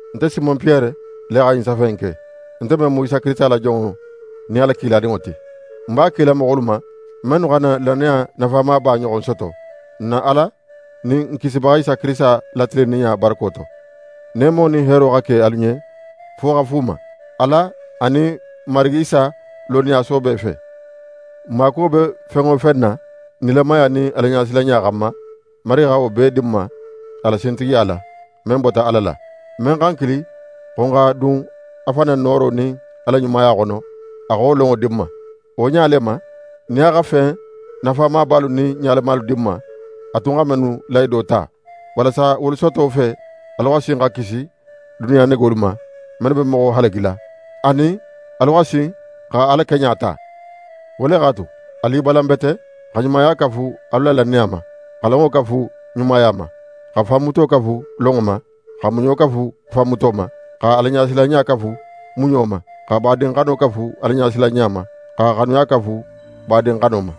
Nte Simon Piyere le xa ɲin safe in ke, nte men mu Isa Kirisita la jonŋo nin a la kiladinŋo ti. Ń b'a kila moxolu ma, mennu xa n na lannaya nafamaba ɲoxon soto, n na Ala nin n Kisibaxa Isa Kirisita la tilinninɲa barako to. Neemo nin heero xa ke alu ɲen fo xa fuuma, Ala anin n Marigi Isa lonniya soobe fe. N maakuwo be fen wo fen na nilamaya nin Alaɲasilanɲa xanma, Marigi xa wo bee di n ma a la sintigiya la, men bota Ala la. Men xa n kili xo n xa dun a fan na nooro nin a la ɲumaya xono, a xa wo lonŋo di n ma. Wo ɲa le ma, nin a xa fen nafamabalu nin ɲalamalu di n ma, a tun xa mennu lahido ta, walasa wolu soto fe, alu xa sin xa kisi duniya negolu ma, mennu be moxo halagila, anin alu xa sin xa Ala keɲa ta. Wo le x'a tu, alu i balan bete xa ɲumaya kafu alu la lannaya ma, xa lonŋo kafu ɲumaya ma, xa fanmuto kafu lonŋo ma, xa muɲo kafu fanmuto ma, xa Alaɲasilanɲa kafu muɲo ma, xa badinxano kafu Alaɲasilanɲa ma, xa xanuya kafu badinxano ma.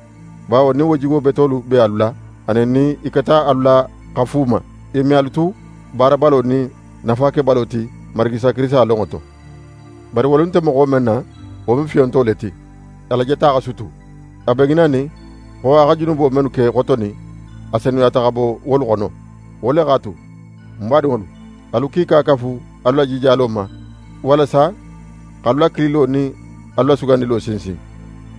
Bawo nin wo jigo betolu be alu la, anin nin i keta alu la xa fuuma, i me alu tu baarabalo nin nafakebalo ti n Marigi Isa Kirisita lonŋo to. Bari wolu nte moxo men na, wo mu fiyonto le ti, a la jeta xa sutu. A be ŋinanin xo a xa junubo mennu ke xotonin, a senuyata xa bo wolu xono. Wo le x'a tu, ń badinŋolu, alu kiika kafu alu la jijalo ma walasa x'alu la kililo nin alu la sugandilo sinsin.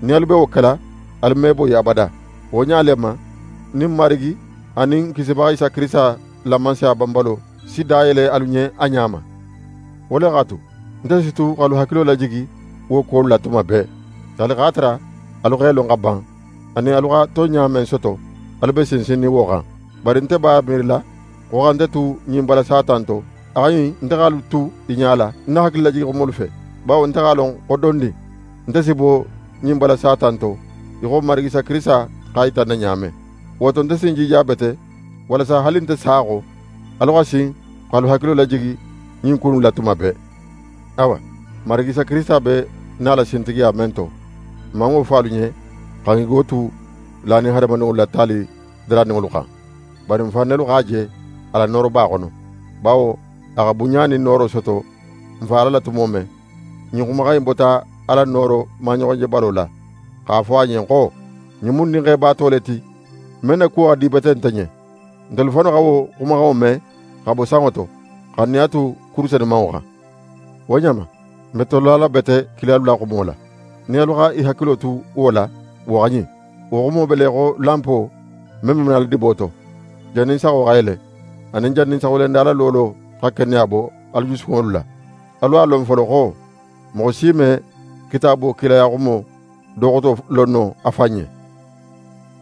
Nin alu be wo kela, alu me boyi abada. Wo ɲa le ma, nin n Marigi anin n Kisibaxa Isa Kirisita la Mansaya banbalo si dayele alu ɲen a ɲa ma. Wo le x'a tu, nte si tu x'alu hakilo lajigi wo kuwolu la tuma bee, haali x'a tara alu x'e lon xa ban, anin alu xa tonɲa men soto, alu be sinsinnin wo xan. Bari nte b'a miirila xo xa nte tu ɲin bala sata in to, a xa ɲin nte x'alu tu i ɲala ń na hakililajigi xumolu fe. Bawo nte x'a lon xo dondin, nte si bo ɲin bala sata in to, í xo n Marigi Isa Kirisita x'a yita ń na ɲa men. Wo to, nte si ń jija bete walasa haali nte sa xo, alu xa sin x'alu hakilo lajigi ɲin ku innu la tuma bee. Awa, n Marigi Isa Kirisita be nala sintigiya men to, n man wo fo alu ɲen xa n gigo tu lanin hadamadinŋolu la taali daraninŋolu xan. Bari n fan nelu ɲa x'a je a la nooroba xono. Bawo a xa bunɲa nin nooro soto n Fa Ala la tumo men, ɲin xumaxan in bota Ala nooro maɲoxonjebalo la x'a fo a ɲen xo: «Ɲin mu ń Dinxe baato le ti, men na kuwo xa di bete nte ɲen.» Ntelu fannu xa wo xumaxanŋo me xa bo sanŋo to, xa n nin a tu kuru senumanŋo xan. Wo ɲa ma, n be tolala bete kilalu la xumo la. Nin alu xa i hakilo tu wo la, wo xa ɲin: Wo xumo be le í xo lanpo men be manala dibo to, jannin saxo xa yele, anin jannin saxuyelenda la loolo xa keneya bo alu jusukunŋolu la. Alu a lon folo xo moxo si me Kitaabo kilayaxumo do xoto lon no a fan ɲen.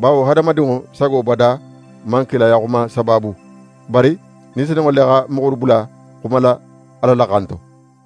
Bawo hadamadinŋo sago bada man kilayaxuma sabaabu, bari Ni Senunŋo le xa moxolu bula xumala Ala la xan to.